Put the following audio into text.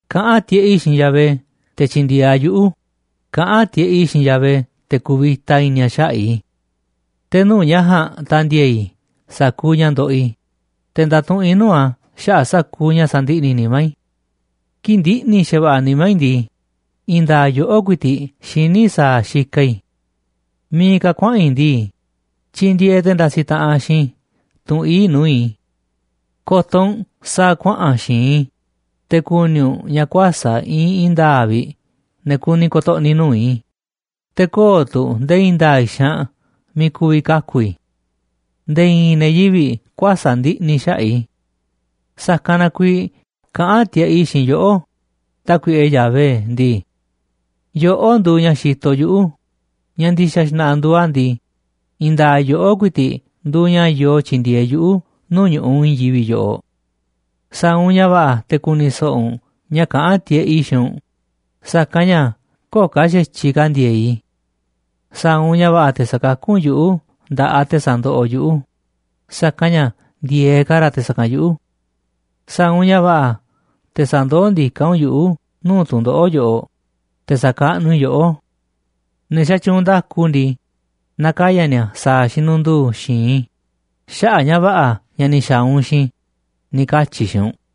Kaꞌán tiꞌeꞌ i̱ xiinꞌ Yahvé, te̱ tyi̱ndi̱e̱eꞌ a̱ yuꞌu̱, kaꞌán tiꞌeꞌ i̱ xiinꞌ Yahvé, te̱ ku̱vi̱ta i̱ni̱ a̱ xaꞌa̱ꞌ i̱. Te̱ nuu̱ꞌ ña̱ ja̱a̱nꞌ ta̱ndi̱e̱e̱ i̱ sa̱kuuꞌ ña̱ ndoꞌoꞌ i̱, te̱ ndatuꞌunꞌ i̱ nuu̱ꞌ a̱ xaꞌa̱ꞌ sa̱kuuꞌ ña̱ sandiꞌni̱ nimá i̱. Kii̱ꞌ ndiꞌni̱ xa̱va̱ꞌa̱ nimá i̱ ndii, i̱i̱n nda̱a̱ꞌ yoꞌó ku̱i̱ti̱ꞌ xiní sa̱a̱ xikaꞌ i̱. Miiꞌ ka̱ kuaꞌa̱n i̱ ndii, tyindieeꞌ te̱ ndasiꞌ taꞌanꞌ xiinꞌ i̱ tunꞌ ii̱ꞌ nuu̱ꞌ i̱. Ko̱to̱ u̱nꞌ sa̱a̱ kuaꞌa̱n xi̱i̱nꞌ i̱, te̱ ku̱ni̱ u̱nꞌ ña̱ kuäsa̱ꞌ iinꞌ i̱i̱n nda̱a̱ꞌ vi̱ꞌ ne̱ kuni ko̱to̱ꞌni̱ nuu̱ꞌ i̱, te̱ köo̱ꞌ tu̱ nde̱e̱ i̱i̱n nda̱a̱ꞌ xaanꞌ miiꞌ ku̱vi̱ kaku̱ i̱. Nde̱e̱ i̱i̱n ne̱ yivi̱ꞌ kuäsa̱ꞌ ndiꞌni̱ xaꞌa̱ꞌ i̱. Sa̱kanꞌ na kuiiꞌ kaꞌán tiꞌeꞌ i̱ xiinꞌ yoꞌó, Tákuiꞌe Yahvé ndii: “Yoꞌó nduuꞌ ña̱ xitoꞌ yuꞌu̱, ña̱ ndi̱xa̱ xna̱ꞌa̱ nduuꞌ a̱ ndii, i̱i̱n nda̱a̱ꞌ yoꞌó ku̱i̱ti̱ꞌ nduuꞌ ña̱ yoo tyindieeꞌ yuꞌu̱ nuu̱ꞌ ñu̱ꞌuꞌ i̱i̱n yivi̱ꞌ yoꞌoꞌ. Sa̱a̱ u̱nꞌ ña̱ va̱ꞌa̱ te̱ ku̱ni̱ so̱ꞌo̱ u̱nꞌ ña̱ kaꞌán tiꞌeꞌ i̱ xiinꞌ u̱nꞌ, sa̱kanꞌ ña̱ köo̱ꞌ ka̱ xa̱tyiꞌ ka̱ ndi̱e̱e̱ꞌ i̱. Sa̱a̱ u̱nꞌ ña̱ va̱ꞌa̱ te̱ sa̱kakú u̱nꞌ yuꞌu̱ nda̱ꞌaꞌ te̱ sandoꞌoꞌ yuꞌu̱, sa̱kanꞌ ña̱ ndi̱e̱eꞌ ka̱ ra̱ te̱ sa̱kanꞌ yuꞌu̱. Sa̱a̱ u̱nꞌ ña̱ va̱ꞌa̱ te̱ sa̱ndoó ndiká u̱nꞌ yuꞌu̱ nuu̱ꞌ tu̱ndoꞌo̱ꞌ yoꞌoꞌ, te̱ sa̱kaꞌnuꞌ i̱ yoꞌó. Ne̱ xatyuunꞌ nda̱ku ndii, na̱kaya̱ ni̱a̱ sa̱a̱ xinundu̱u̱ xi̱i̱nꞌ i̱ xaꞌa̱ꞌ ña̱ va̱ꞌa̱ ña̱ ni̱ xa̱a̱ u̱nꞌ xiinꞌ i̱”, ni̱ katyi̱ i̱ xiinꞌ u̱nꞌ.